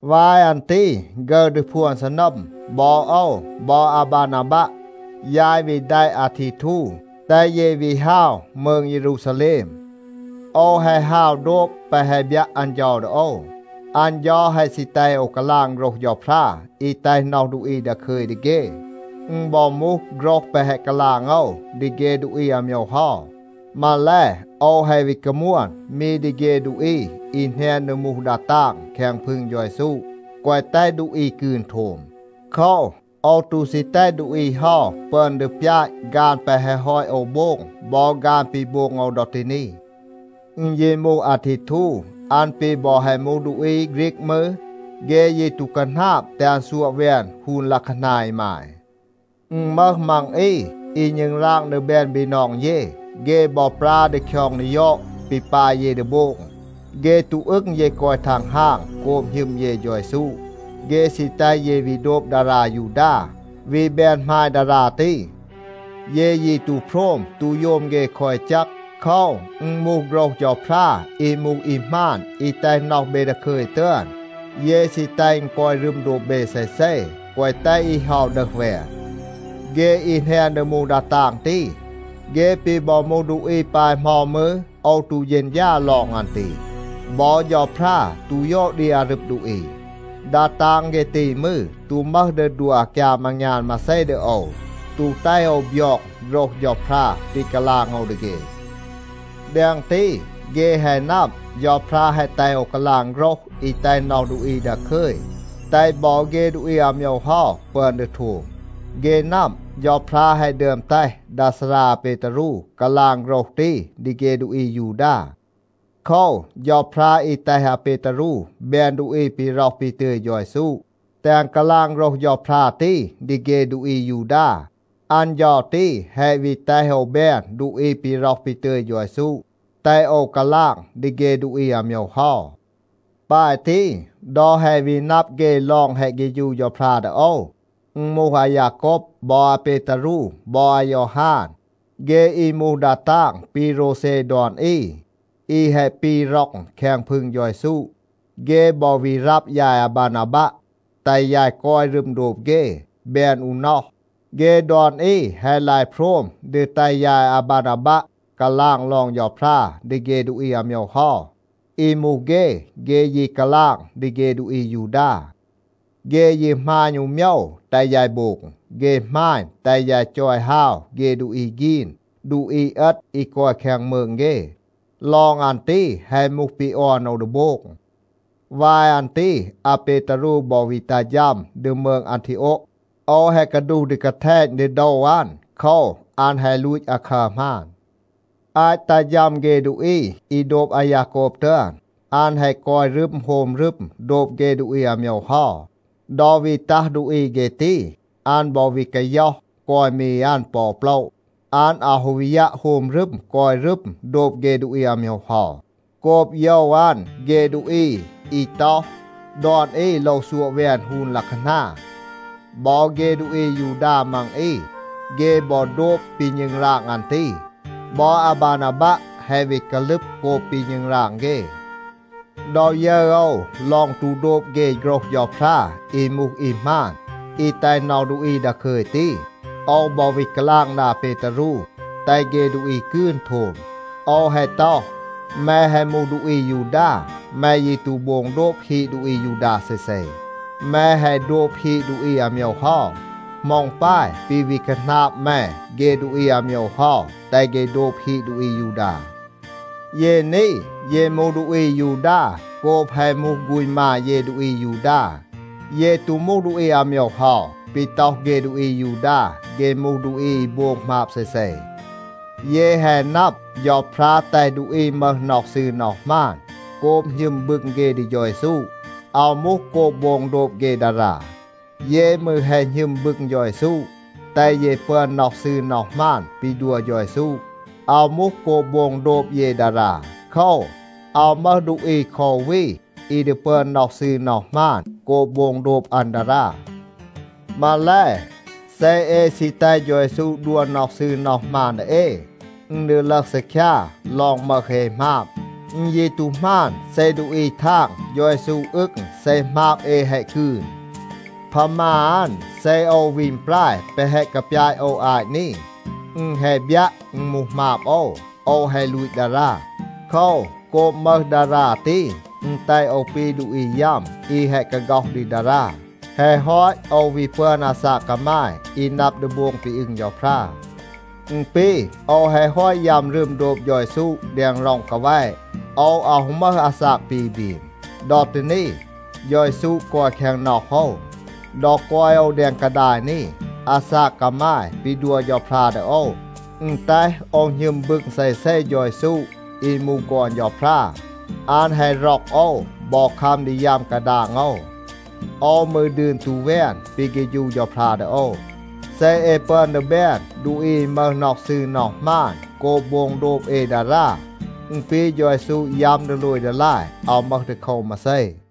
วาย อัน ตี ฆึร ดี พวน ซีนัม, บอ โอว บอ อาบานาบัะ, ยาย วี แดะ อาทีทู, แตห เย วี ฮาว มืง เยรูซาแลม. โอว แฮะ ฮาว โดบ แปะ แฮะ บยัะ อัน เฌา ดี โอว. อัน เฌา แฮะ ซี แตห โอว กาลาง โฆรห เฌาพรา อี แตห น็อห ดูอี ดาคึย ดี เฆ. อึณ บอ มูห โฆรห แปะ แฮะ กาลาง โอว ดี เฆ ดูอี อาโมยว เฮา. มาแล, โอว แฮะ วี กามวน มี ดี เฆ ดูอี อี แหนน ดี มูห ดา ตาง แคง พึง เฌา เยซู, แกวะ แตห ดูอี กืน โทม. โคว, โอว ตู ซี แตห ดูอี เฮา ปึอน ดี ปยาต ฆาน แปะ แฮะ ฮอต โอว โบง บอ ฆาน ปี โบง โอว ดอ ตี นี. อึณ ยี มูห อาทีทู, อัน ปี บอ แฮะ มูห ดูอี ฆรีก มืร, เฆ ยี ตู คาหนาบ แตห อัน ซัวะ แวน ฮูน ลัะคานา อีมาย. อึณ มึห มี มัง อี อี ณึงราง ดี แบน บีนอง เย, เฆ บอ ปรา ดี คยอง ดี ยอด ปี ปาย เย ดี โบง. เฆ ตู อึง เย กอย ทังฮาง โกบ หณึม เย เฌา เยซู. เฆ ซี แตห เย วี โดบ ดารา ยูดา, วี แบน หมาย ดารา ตี. เย ยี ตู โพรม ตู โยม เฆ คอ อี แจก. โคว, อึณ มูห โฆรห เฌาพรา อี มูห อี หมาน อี แตห น็อห เบ ดาคึย ตึอน, เย ซี แตห อึณ กอย รึม โดบ เบ เซเซ, แกวะ แตห อี เฮา ดึห แวน. เฆ อี แหนน ดี มูห ดา ตาง ตี, เฆ ปี บอ มูห ดูอี ปาย เหมา มืร, โอว ตู เฌณฌา ลอง อัน ตี. บอ เฌาพรา ตู ยอด ดี อารึบ ดูอี. ดา ดาง เฆ ตี มืร, ตู มึห ดี ดัว อากยาม อางยาน มาเซ ดี โอว, ตู แตห โอว บยอง โฆรห เฌาพรา ปี กาลาง โอว ดี เฆ. แดง ตี, เฆ แฮะ นับ, เฌาพรา แฮะ แตห โอว กาลาง โฆรห อี แตห น็อห ดูอี ดาคึย, แตห บอ เฆ ดูอี อาโมยว เฮา ปึอน ดี โทม. เฆ นับ, เฌาพรา แฮะ ดึอม แตห ดา ซารา อาเปตารู กาลาง โฆรห ตี ดี เฆ ดูอี อายูดา. โคว, เฌาพรา อี แตห อาเปตารู แบน ดูอี ปี ร็อห ปี ตึย เฌา เยซู, แตห อัน กาลาง โฆรห เฌาพรา ตี ดี เฆ ดูอี อายูดา, อัน เฌา ตี แฮะ วี แตห โอว แบน ดูอี ปี ร็อห ปี ตึย เฌา เยซู, แตห โอว กาลาง ดี เฆ ดูอี อาโมยว เฮา. ปาย ตี, ดอ แฮะ วี นับ เฆ ลอง แฮะ เฆฌู เฌาพรา ดี โอว, อึณ มูห อายาโกบ, บอ อาเปตารู, บอ อายอฮาน, เฆ อี มูห ดา ตาง ปี โรวเซ ดอน อี, อี แฮะ ปี ร็อง แคง พึง เฌา เยซู, เฆ บอ วี รับ ยาย อาบานาบัะ, แตห ยาย กอย รึม โดบ เฆ, แบน อู น็อห. เฆ ดอน อี แฮะ ลาย โพรม ดี แตห ยาย อาบานาบัะ กาลาง ลอง เฌาพรา ดี เฆ ดูอี อาโมยว เฮา. อี มูห เฆ, เฆ ยี กาลาง ดี เฆ ดูอี อายูดา. เฆ ยี หมาณ อู โมยว, แตห ยาย โบง. เฆ หมาณ, แตห ยาย จอย ฮาว เฆ ดูอี ฆีน, ดูอี เอต อี กอย แคง มืง เฆ. ลอง อัน ตี แฮะ มูห ปี ออน โอว ดี โบง. วาย อัน ตี อาเปตารู บอ วี ตัห ฌัม ดี มืง อันทีโอะ. โอว แฮะ กาดูห ดี กาแทณ ดี โดว อัน. โคว, อัน แฮะ ลูต คาคัร หมาน. อาต ตัห ฌัม เฆ ดูอี อี โดบ อายาโกบ ตึอน, อัน แฮะ กอย รึม โฮม รึม โดบ เฆ ดูอี อาโมยว เฮา. ดอ วี ตัห ดูอี เฆ ตี, อัน บอ วี กาย็อห กอย มี อัน ปอ โปละ. อัน อาว ฮู วี ยัะ โฮม รึม กอย รึม โดบ เฆ ดูอี อาโมยว เฮา โกบ โยว อัน เฆ ดูอี อี ต็อห, ดอน อี โลว ซัวะ แวน ฮูน ลัะคานา. บอ เฆ ดูอี อายูดา มัง อี, เฆ บอ โดบ ปี ณึงราง อัน ตี. บอ อาบานาบัะ แฮะ วี กาลึบ โกบ ปี ณึงราง เฆ. ดอ ยึร โอว ลอง ตู โดบ เฆ โฆรห เฌาพรา อี มูห อี หมาน, อี แตห น็อห ดูอี ดาคึย ตี, โอว บอ วี กาลาง ดี อาเปตารู แตห เฆ ดูอี กืน โทม. โอว แฮะ ต็อห, “แม แฮะ มูห ดูอี อายูดา. แม ยี ตู โบง โดบ ฮีด ดูอี อายูดา เซเซ. แม แฮะ โดบ ฮีด ดูอี อาโมยว เฮา. เหมา อึณ ปาย ปี วี คาหนาบ แม เฆ ดูอี อาโมยว เฮา, แตห เฆ โดบ ฮีด ดูอี อายูดา?” เย นี, เย มูห ดูอี อายูดา โกบ แฮะ มูห ฆูณ มา เย ดูอี อายูดา. เย ตู มูห ดูอี อาโมยว เฮา ปี ต็อห เฆ ดูอี อายูดา, เฆ มูห ดูอี อี โบง หมาบ เซเซ. เย แฮะ นับ, เฌาพรา แตห ดูอี มึห น็อห ซืร น็อห หมาน โกบ หณึม บึง เฆ ดี เฌา เยซู. อาว มูห โกบ โบง โดบ เฆ ดารา. เย มืร แฮะ หณึม บึง เฌา เยซู, แตห เย ปึอน น็อห ซืร น็อห หมาน ปี ดัว เฌา เยซู. อาว มูห โกบ โบง โดบ เย ดารา. โคว, อาว มึห ดูอี คอ อู วี อี ดี ปึอน น็อห ซืร น็อห หมาน โกบ โบง โดบ อัน ดารา. มาแล, เซ เอ ซี แตห เฌา เยซู ดัว น็อห ซืร น็อห หมาน ดี เอ, อึณ ดี ลึห ซีคยา ลอง มึห เอ หมาบ. อึณ ยี ตู หมาน เซ ดูอี ทาง เฌา เยซู อึง เซ หมาบ เอ แฮะ กืน. พามา อัน, เซ โอว วี อึณปราย แปะ แฮะ กาปยาต โอว อาต นี, อึณ แฮะ บยัะ, อึณ มูห หมาบ โอว. โอว แฮะ ลูต ดารา. โคว, โกบ มึห ดารา ตี, อึณ แตห โอว ปี ดูอี ยัม, อี แฮะ กาฆ็อห ดี ดารา. แฮะ ฮอต, โอว วี ปึอน อาซาก กามาย อี นับ ดี โบง ปี อึง เฌาพรา. อึณ ปี โอว แฮะ ฮอต ยัม รึม โดบ เฌา เยซู แดง ร็อง กาแวะ. โอว อาว ฮู มึห อาซาก ปี บรีม. ดอ ตี นี, เฌา เยซู กอย แคง น็อห โอว. ดอ กอย โอว แดง กาดาย นี, อาซาก กามาย ปี ดัว เฌาพรา ดี โอว, อึณ แตห โอว หณึม บึง เซเซ เฌา เยซู อี มูห ฆอน เฌาพรา. อัน แฮะ ร็อก โอว บอ คัม ดี ยัม กาดาง โอว. โอว มืร ดืน ตู แวน ปี เฆฌู เฌาพรา ดี โอว. เซ เอ ปึอน ดี แบน ดูอี อี มึห น็อห ซืร น็อห หมาน โกบ โบง โดบ เอ ดารา, อึณ ปี เฌา เยซู ยัม ดีโลย ดีลาย, อาว มึห ดีโคว มาเซ.